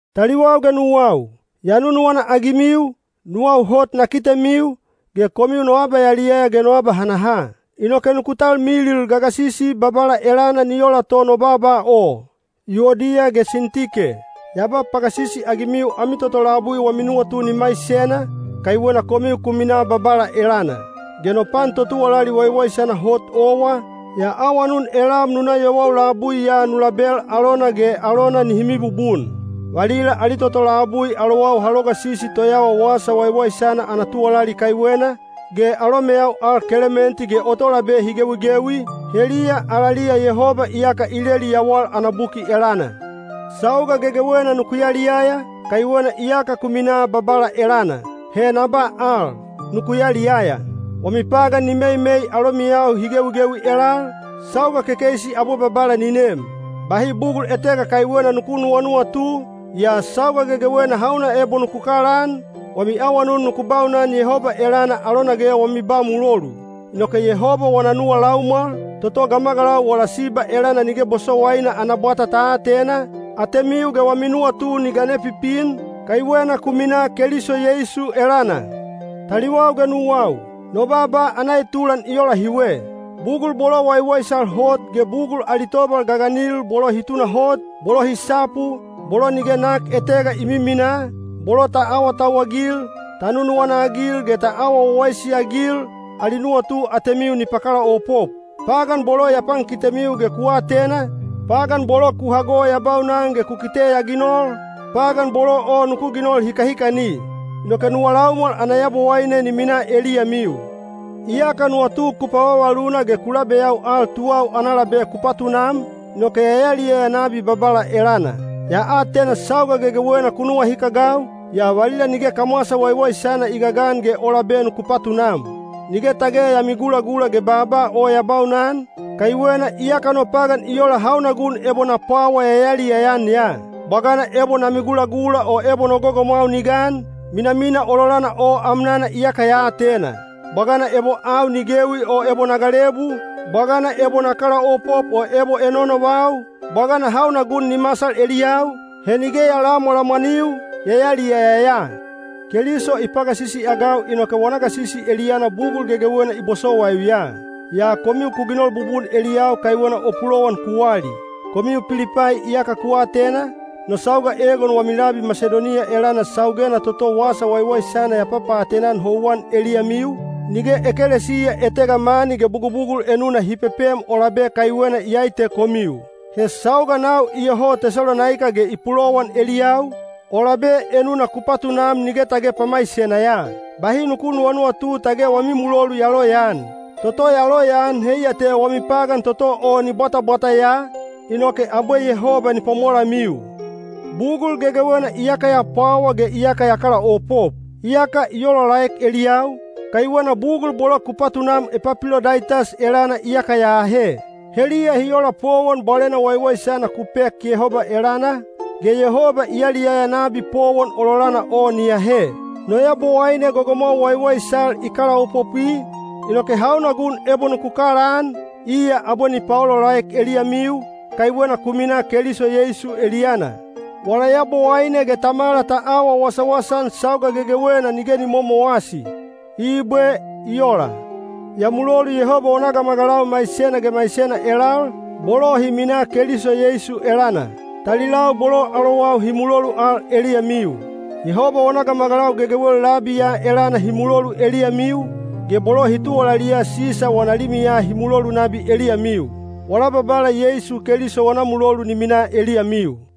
Taliwau ge nuwau, ya nunuwana-agimiu, nuwau hot na kitemiu, ge komiu no abayaliyaya ge no abahanaha. Inoke nuku talmilil gagasisi Babala elana ni ola to no baaba o. Yuodiya ge Sintike, ya ba pagasisi-agimiu ami toto labui wami nuwatu ni maisena, kaiwena komiu ku minaa Babala elana. Ge no pan totuwalali waiwaisana hot owa, ya awanun elam nu na yowau labui ya nu label alona ge alona nihi mibubun. Valila ali toto labui alowau ha logasisi toyawa wasa waiwaisana ana tuwalali kaiwena, ge alomeyau al Kelementi ge o tolabe hi gewigewi, heliya alaliya Yehoba iyaka i leli yawal ana buki elana. Sauga gegewena nuku yaliyaya, kaiwena iyaka ku minaa Babala elana. He na ba al: nuku yaliyaya. Wami pagan ni meimei alomiyau hi gewigewi elal. Sauga kekeisi abwe Babala ni nem. Bahi bugul etega kaiwena nuku nuwanuwatu, yaa sauga gegewena hauna ebo nuku kalaan, wami awanun nuku baunan Yehoba elana alona ge wami ba mulolu. Inoke Yehoba wana nuwa laumwal, toto gamagalau wala siba elana nige bosowaina ana bwata ta atena, atemiu ge wami nuwatu ni gane pipin, kaiwena ku minaa Keliso Yeisu elana. Taliwau ge nuwau, no baaba ana etulan i ola hiwe. Bugul bolo waiwaisal hot ge bugul ali tobal gaganil—bolo hi tunahot, bolo hi sapu, bolo nige nak etega i miminaa, bolo ta awatauwagil, ta nunuwana-agil ge ta awa wawaisi-agil—ali nuwatu atemiu ni pakalaopop. Pagan bolo ya pankitemiu ge ku atena, pagan bolo ku hago ya baunan ge ku kite ya ginol, pagan bolo o nuku ginol hikahikani. Inoke nuwa laumwal ana Yabowaine ni minaa eliyamiu. Iyaka nuwatu ku pavavaluna ge ku labeyau al tuwau ana labe ku patunam, inoke ya yaliyaya nabi Babala elana. Ya atena sauga gegewena ku nuwahikagau, yaa valila nige kamwasa waiwaisana i gagan ge o labe nuku patunam. Nige tage ya migulagula ge baaba o ya baunan, kaiwena iyaka no pagan i ola hauna gun ebo na pwawa ya yaliyaya-an ya. Bwagana ebo na migulagula o ebo no gogomwau ni gan, minamina ololana o amnana iyaka ya atena. Bwagana ebo au ni gewi o ebo na galebu, bwagana ebo na kalaopop o ebo enoenovau, bwagana hauna gun ni masal eliyau, he nige ya lamwalamwaniu, ya yaliyaya ya. Keliso i pagasisi-agau inoke wana gasisi eliyana bugul gegewena i bosowaiu ya. Yaa komiu ku ginol bubun eliyau kaiwena o pulowan ku wali. Komiu Pilipai iyaka ku atena, no sauga egon wami labi Masidoniya elana saugena toto wasa waiwaisana ya papaatena-an houwan eliyamiu, nige ekelesiya etega mani ge bugubugul enuna hi pepem o labe kaiwena iyai te komiu. He sauga nau iyoho Tesalonaika ge i pulowan eliyau, o labe enuna ku patunam nige tage pamaisena ya. Bahi nuku nunuwatu tage wami mulolu ya loyaan. Toto ya loyaan heiya te wami pagan toto o ni bwatabwata ya, inoke abwe Yehoba ni pwamolamiu. Bugul gegewena iyaka ya pwawa ge iyaka ya kalaopop. Iyaka i olaolaek eliyau, kaiwena bugul bolo ku patunam Epapilodaitas elana iyaka ya ahe. Heliya hi ola powon bwalena waiwaisana ku pek Yehoba elana, ge Yehoba i yaliyaya nabi powon ololana o ni ahe. No Yabowaine gogomwau waiwaisal i kalaopopwi, inoke hauna gun ebo nuku kalaan, iya abwe ni paolaolaek eliyamiu, kaiwena ku minaa Keliso Yeisu eliyana. Wala Yabowaine ge Tamala ta awa wasawasa-an sauga gegewena nige ni momowasi. Ibwe. I ola. Ya mulolu Yehoba wana gamagalau maisena ge maisena elal, bolo hi minaa Keliso Yeisu elana. Talilau bolo alowau hi mulolu al eliyamiu. Yehoba wana gamagalau gegewel labi ya elana hi mulolu eliyamiu, ge bolo hi tuwalaliya Sisa wana limiya hi mulolu nabi eliyamiu. Wala Babala Yeisu Keliso wana mulolu ni minaa eliyamiu.